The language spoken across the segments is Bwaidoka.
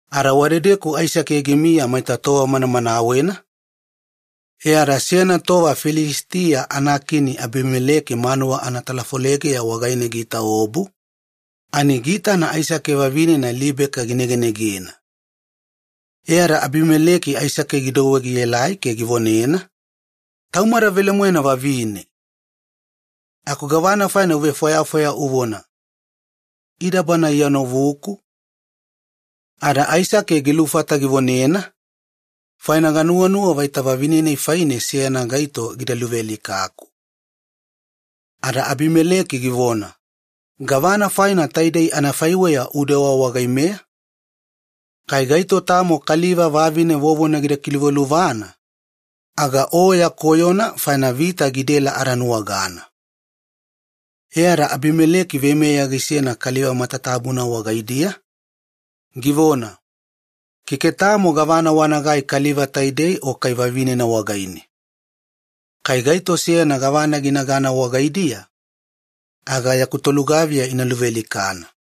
Ada wadedeku Aisake gimiya maita tova manamanawena, e ada seyana tova Filisitiya anakini Abimeleki manuwa anatalafolega wagaine giitaobu ani giitana Aisake vavinena Libeka ginegenegena. E ada Abimeleki Aisake gidouwe gielai ke givonena, “Taumada velemoena vavine! Aku gavana faina uvefwayafwaya uvona, 'Ida bana iya novuku?'” Ada Aisake gilufata givonena, “Faina ganuwanuwa vaita vavine-nai faine seyana gaito gida luvealikaku.” Ada Abimeleki givona, “Gavana faina taidei anafaiweya udewa wagaimeya? Kai gaito tamo kaliva vavine vovona gida kiluvaluvana aga o ya koyona faina vita gidaela adanuwagana.” E ada Abimeleki veimeya gisena kaliva matatabuna wagaidiya, givona, “Keke tamo gavana wanagai kaliva taidei o kai vavinena wagaine. Kai gaito seyana gavana ginagana wagaidiya aga yaku tolugaviya ina luvealikana.”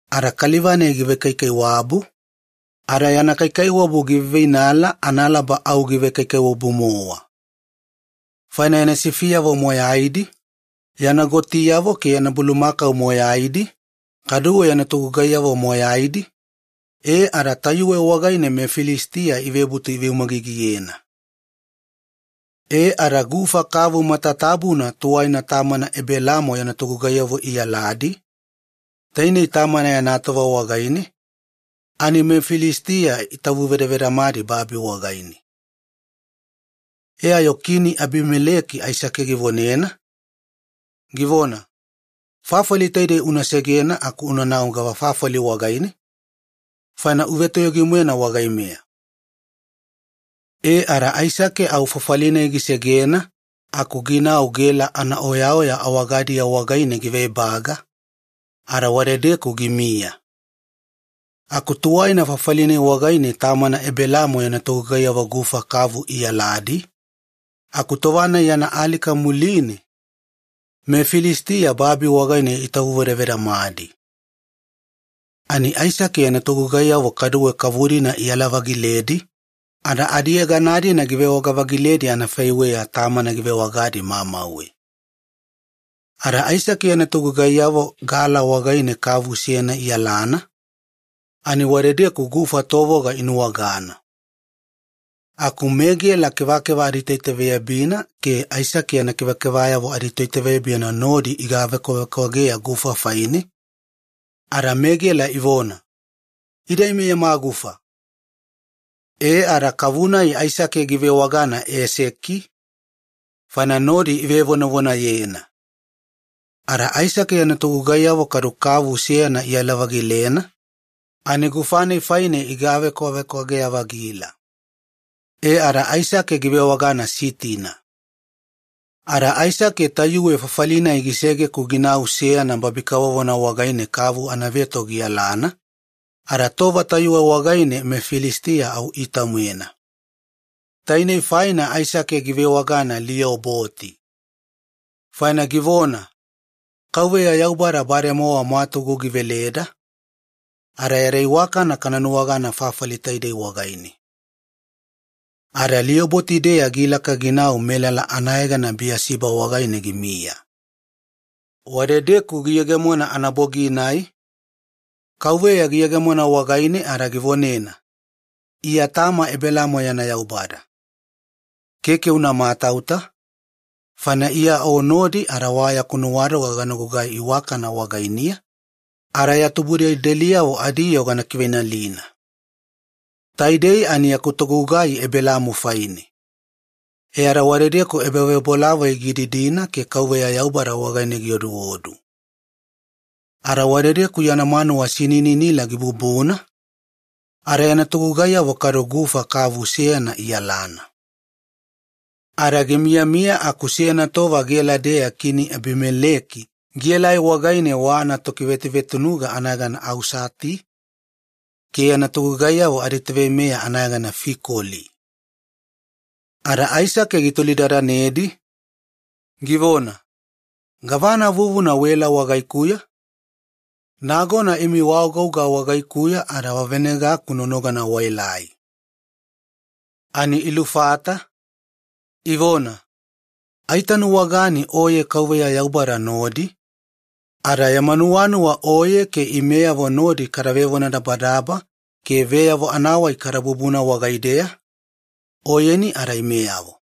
Ada kaliva-nai givekaikaiwabu, ada yana kaikaiwabu giveiveinala analaba au givekaikaiwabu-mowa. Faina yana sifiyavo moyaidi, yana gotiyavo ke yana bulumakau moyaidi, kaduwe yana togugaiyavo moyaidi, e ada tayuwe wagaine meFilisitiya ivebutu iveumagigiyena. E ada gufa kavu matatabuna tuwaina tamana Ebelaamo yana togugaiyavo iyaladi, tainei tamana yana tova wagaine, ani meFilisitiya itavuvedavedamadi babi wagaine. Ada taidei gaitoma-nai muline, kini Abimeleki givonena Aisake, givona, “Fafali taidei una segena aku unanau gava fafali wagaine, faina uvetoyogi-moena wagaimeya.” E ada Aisake au fafali-nai gisegena aku ginau Gela anaoya awagadiya wagaine giveebaga ada wadedeku gimiya. Aku tuwaina fafali-nai wagaine tamana Ebelaamo yana togugaiyavo gufa kavu iyaladi, aku tova-nai yana alika muline meFilisitiya babi wagaine itavuvedavedamadi. Ani Aisake yana togugaiyavo kaduwe kavu-dina iyala-vagiledi ada adiyegana-dina givewaga-vagiledi anafaiweya tamana givewagadi mamauwe. Ada Aisake yana togugaiyavo gala wagaine kavu seyana iyalana ani wadedeku gufa tovoga inuwagana. Aku meGela kevakeva aditoitaveyabina ke Aisake yana kevakevayavo aditoitaveyabina nodi igavekwavekwageya gufa faine ada meGela ivona, “Ida ime yama gufa!” E ada kavu-nai Aisake givewagana ‘Eseki’, faina nodi ivevonavonayena. Ada Aisake yana togugaiyavo kavu velugana kaduwe iyala-vagilena ani gufa-nai faine igavekwavekwageya-vagila. E ada Aisake givewagana ‘Sitina’. Ada Aisake tayuwe fafali-nai gisege-ku ginau seyana babi kavovona wagaine kavu anaveto giyalana, ada tova tayuwe wagaine meFilisitiya au iita-moena. Tainei faina Aisake givewagana ‘Lioboti’, faina givona, “Yaubada bademowa mwatugu giveleda ke yada iwakana kana nuwagana fafali taidei wagaine.” Ada Lioboti-deya gilaka ginau Biyasiba wagaine ginamiya. Wadedeku giyegemona anabogi-nai Yaubada giyegemona wagaine ada givonena, “Iya tama Ebelaamo yana Yaubada. Keke una matauta, faina Iya o nodi, ada gana lemeni ada ya tubudelideliyavo adiyoo gana kiveinalina yaku togugai Ebelaamo faine.” E ada wadedeku ebavebolavoi gididina ke Yaubada wagaine gioduodu. Ada wadedeku yana manuwa sinininila gibubuna ada yana togugaiyavo gufa kavu seyana iyalana. Ada gimiyamiya aku seyana tova Gela-deya kini Abimeleki gielai wagaine wa anatokivetuvetunuga anayegana Ausati ke yana tolugaviyayavo aditoveimeya anayegana Fikoli. Ada Aisake gitolidadanedi, givona, “Gavana vuvuna waela wagaikuya? Nagona imi waagouga wagaikuya ada wavenegaku nonogana waelai.” Ani ilufata, ivona, “Aitanuwagana oye Yaubada nodi, ada yama nuwanuwa oye ke imeyavo nodi kada vevonadabadaba ke veyavo anavonadabadaba kada bubuna wagaideya oyeni ada imeyavo,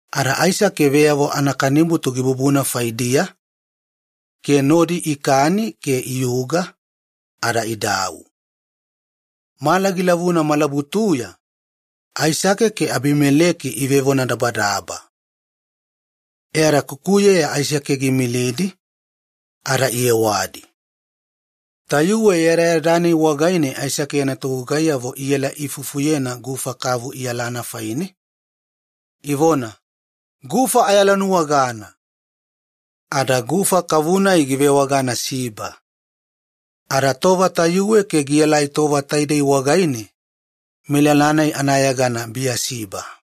Ada Aisake veyavo anakanibutu gibubuna faidiya, ke ikani e ada idau. Mala gilavuna malabutuya Aisake ke Abimeleki ivevonadabadaba, muline Aisake giimilidi kukuyeya iyewadi. Tayuwe yadayada-nai wagaine Aisake yana togugaiyavo iela iifufuyena gufa kavu iyalana faine, ivona, “Gufa ayalanuwagana!” Ada gufa kavu-nai anayegana givewagana Siba. Ada tova tayuwe ke tova taidei wagaine melala-nai ivewagana Biyasiba.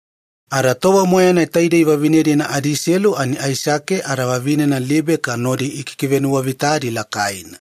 Ada taidei vevine-dina adiselu tova moyaina Aisake ada vavinena Libeka nodi ikikivenuwavita lakaina.